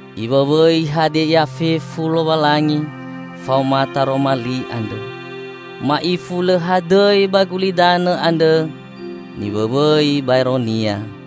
Iwõwõi hadia ia fefu Lowalangi faoma Taroma Li andrõ. Ma'ifu lõ hadõi ba gulidanõ andre niwõwõi baero-Nia.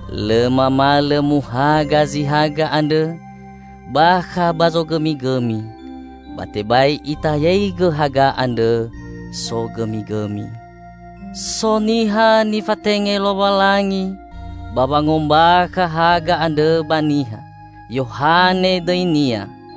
Lõ mamalõ muhaga zi haga andrõ bakha ba zogõmigõmi, ba tebai itayaigõ haga andrõ sogõmigõmi. So niha nifatenge Lowalangi ba wangombakha haga andrõ ba niha. Yohane dõinia.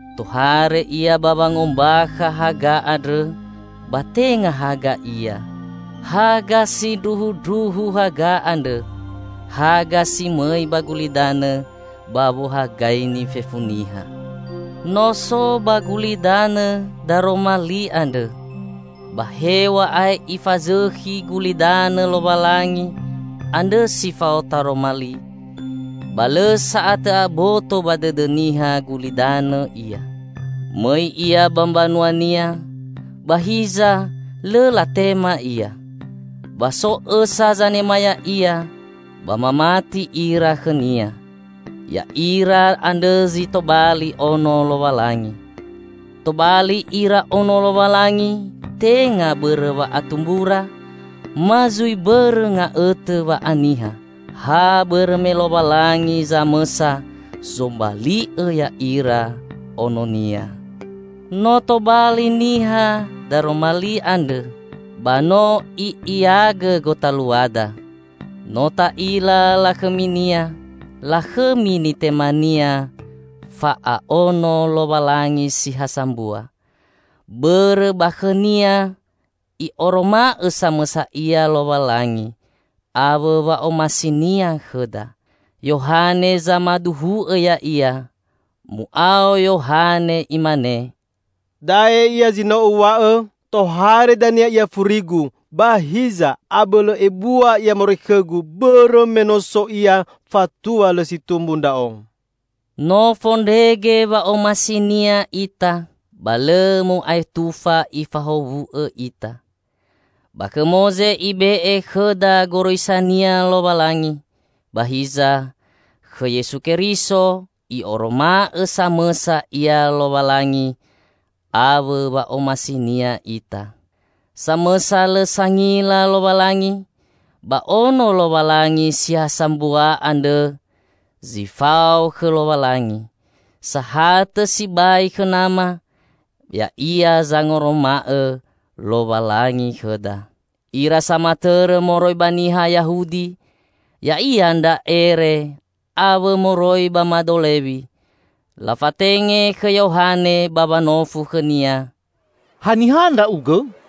Tohare ia ba wangombakha haga andrõ; ba tenga haga ia. Haga sindruhundruhu haga andrõ -- haga si mõi ba gulidanõ ba wohagaini fefu niha. No so ba gulidanõ Daroma Li andrõ. Ba hew̃a'ae Ifazõkhi gulidanõ Lowalangi andre si fao Taroma Li, ba lõ sa'atõ aboto ba dõdõ niha gulidanõ Ia. Mõi Ia ba mbanua-Nia, ba hiza lõ latema Ia. Ba so õsa zanema Ya'ia ba mamati ira khõ-Nia. Ya'ira andrõ zi tobali ono Lowalangi. Tobali ira ono Lowalangi tenga bõrõ wa'atumbura ma zui bõrõ nga'õtõ wa'aniha, ha bõrõ me Lowalangi samõsa zombali'õ ya'ira ono-Nia. No tobali niha Daroma Li andrõ, ba no I'iagõ gotaluada. No ta'ila lakhõmi-Nia, lakhõmi nitema-Nia fa'a'ono Lowalangi si ha sambua. Bõrõ ba khõ-Nia I'oroma'õ samõsa Ia Lowalangi, awõ wa'omasi-Nia khõda. Yohane zamaduhu'õ Ya'ia. Mu'ao Yohane imane, "Da'e Ia zi no uw̃a'õ tohare dania Ia furigu; ba hiza, abõlõ ebua Ia moroi khõgu, bõrõ me no so Ia fatua lõ si tumbu ndra'o." No fondrege wa'omasi-Nia ita, ba lõ mo'aetufa Ifahowu'õ ita. Ba khõ Moze Ibe'e khõda goroisa-Nia Lowalangi, ba hiza, khõ Yesu Keriso I'oroma'õ samõsa Ia Lowalangi awõ wa'omasi-Nia ita. Samõsa lõ sangila Lowalangi, ba ono Lowalangi si ha sambua andrõ zi fao khõ Lowalangi, sahatõ sibai khõ Nama, Ya'ia zangoroma'õ Lowalangi khõda. Ira samatõrõ moroi ba niha Yahudi, ya'ia ndra ere awõ moroi ba mado Lewi, lafatenge khõ Yohane ba wanofu khõnia, "Haniha ndra'ugõ?"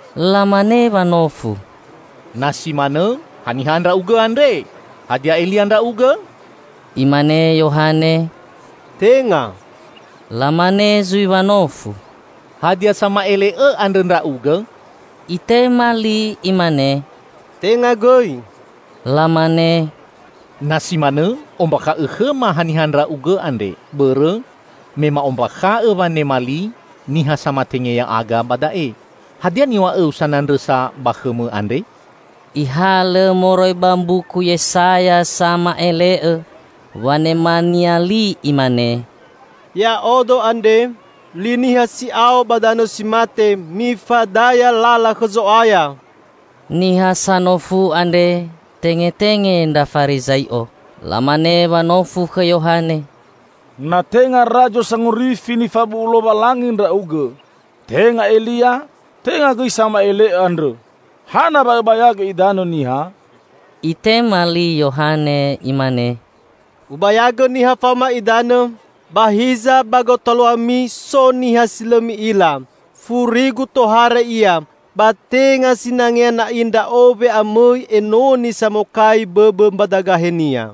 Lamane wanofu, "Na si manõ, haniha ndra'ugõ andre? Hadia Elia ndra'ugõ?" Imane Yohane, "Tenga." Lamane zui wanofu, "Hadia Sama'ele'õ andrõ ndra'ugõ?" Itema li imane, "Tenga gõi." Lamane, "Na si manõ ombakha'õ khõma haniha ndra'ugõ andre, bõrõ me ma'ombakha'õ wanema li niha samatenge ya'aga ba da'e. Hadia niw̃a'õu sanandrõsa ba khõmõ andre?" Ihalõ moroi ba mbuku Yesaya sama'ele'õ wanemania li imane, "Ya'odo andre, 'Li niha si'ao ba danõ si mate: Mifadaya lala khõ Zo'aya!'" Niha sanofu andre tengetenge ndra Farizai'o. Lamane wanofu khõ Yohane, "Na tenga Razo Sangorifi nifabu'u Lowalangi ndra'ugõ, tenga Elia, tenga gõi Sama'ele'õ andrõ, hana wa õbayagõ idanõ niha?" Itema li Yohane imane, "Ubayagõ niha faoma idanõ. Ba hiza ba gotaluami so niha si lõ mi'ila. Furigu tohare Ia, ba tenga sinangea na'i ndra'o we'amõi enoni samokai bõbõ mbadagahe-Nia."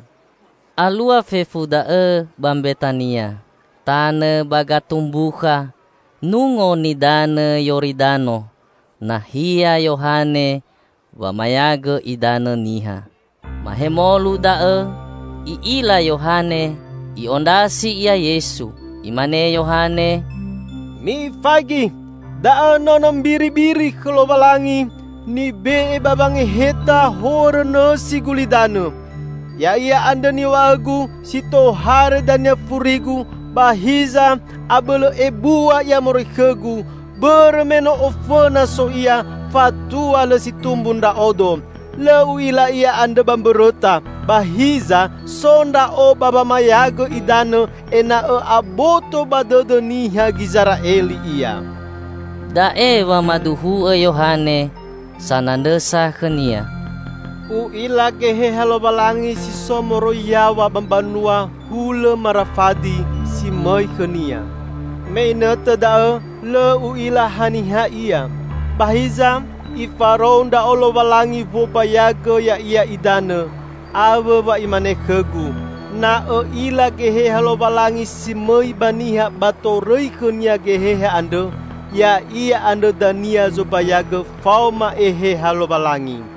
Alua fefu da'õ ba Mbetania, tanõ ba gatumbukha Nungo Nidanõ Yoridano nahia Yohane wamayagõ idanõ niha. Mahemolu da'õ i'ila Yohane I'ondrasi ia Yesu. Imane Yohane, "Mifaigi! Da'õ nono mbiribiri khõ Lowalangi nibe'e ba wangeheta horõ nõsi gulidanõ! Ya'ia andrõ niw̃a'õgu si tohare dania furigu ba hiza abõlõ ebua Ia moroi khõgu; bõrõ me no ofõna so Ia fatua lõ si tumbu ndra'odo. Lõ u'ila Ia andrõ ba mbõrõta, ba hiza so ndra'o ba wamayagõ idanõ ena'õ aboto ba dõdõ niha Gizera'eli Ia." Da'e wamaduhu'õ Yohane sanandrõsa khõ-Nia, "U'ila Geheha Lowalangi si so moroi yaw̃a ba mbanua hulõ marafadi, si mõi khõ-Nia. Me inõtõ da'õ lõ u'ila haniha Ia; ba hiza Ifarou ndra'o Lowalangi wombayagõ Ya'ia idanõ, awõ wa Imane khõgu, 'Na õ'ila Geheha Lowalangi si mõi ba niha ba torõi khõ-Nia Geheha andrõ, Ya'ia andrõ dania zombayagõ faoma Eheha Lowalangi.'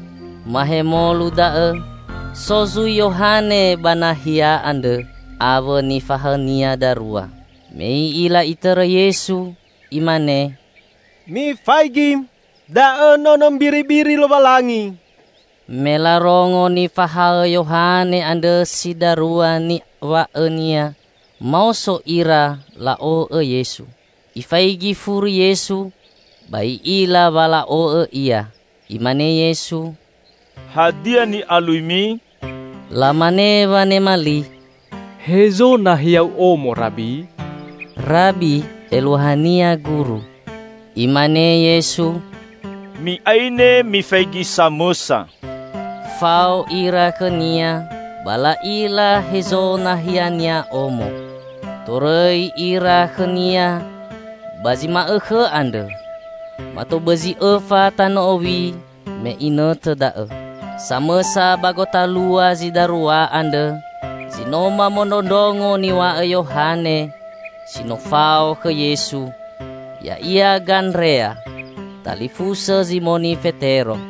Mahemolu da'õ, so zui Yohane ba nahia andrõ awõ nifahaõnia darua. Me i'ila Itõrõ Yesu, imane, "Mifaigi! Da'õ Nono Mbiribiri Lowalangi." Me larongo nifahaõ Yohane andrõ si darua niw̃a'õnia, maoso ira la'o'õ Yesu. Ifaigi furi Yesu, ba I'ila wa la'o'õ Ia. Imane Yesu, "Hadia ni'aluimi?" Lamane wanema li, "Hezo nahia-U omo, Rabi?" ('Rabi' eluahania guru.) Imane Yesu, "Mi'aine mifaigi samõsa." Fao ira khõ-Nia ba la'ila hezo nahia-Nia omo. Torõi ira khõ-Nia ba zi ma'õkhõ andrõ. Mato bõzi õfa tanõ owi me inõtõ da'õ. Samõsa ba gotalua zi darua andrõ, zi no mamondrongo niw̃a'õ Yohane si no fao khõ Yesu ya'ia Gandrea, talifusõ Zimoni Fetero.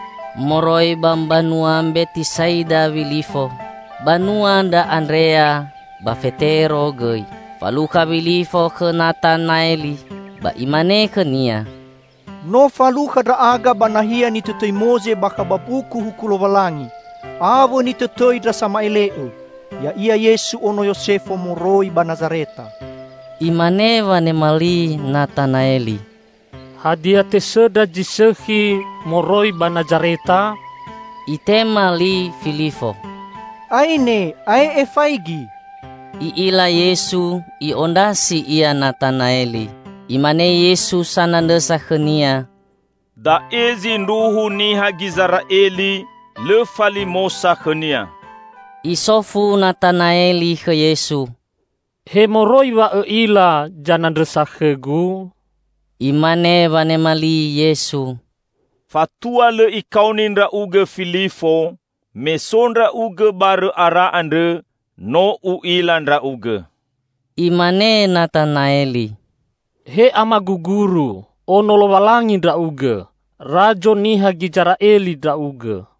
Moroi ba mbanua Mbetisa'ida Wilifo, banua ndra Andrea ba Fetero gõi. Falukha Wilifo khõ Natanaeli ba imane khõnia, "No falukha ndra'aga ba nahia nitõtõi Moze bakha ba mbuku Huku Lowalangi, awõ nitõtõi ndra sama'ele'õ. Ya'ia Yesu ono Yosefo moroi ba Nazareta." Imane wanema li Natanaeli, "Hadia tesõndra zi sõkhi moroi ba Nazareta?" Itema li Filifo, "Aine ae'e faigi." I'ila Yesu i'ondrasi Ia Natanaeli, Imane Yesu sanandrõsa khõnia, "Da'e zindruhu niha Gizera'eli, lõ falimosa khõnia!" Isofu Natanaeli khõ Yesu, "He moroi wa Õ'ila zanandrõsa khõgu?" Imane wanema li, Yesu, "Fatua lõ ikaoni ndra'ugõ Filifo, me so ndra'ugõ barõ ara andrõ, no U'ila ndra'ugõ." Imane Natanaeli, "He Amagu Guru, Ono Lowalangi Ndra'ugõ! Razo niha Gizera'eli Ndra'ugõ!"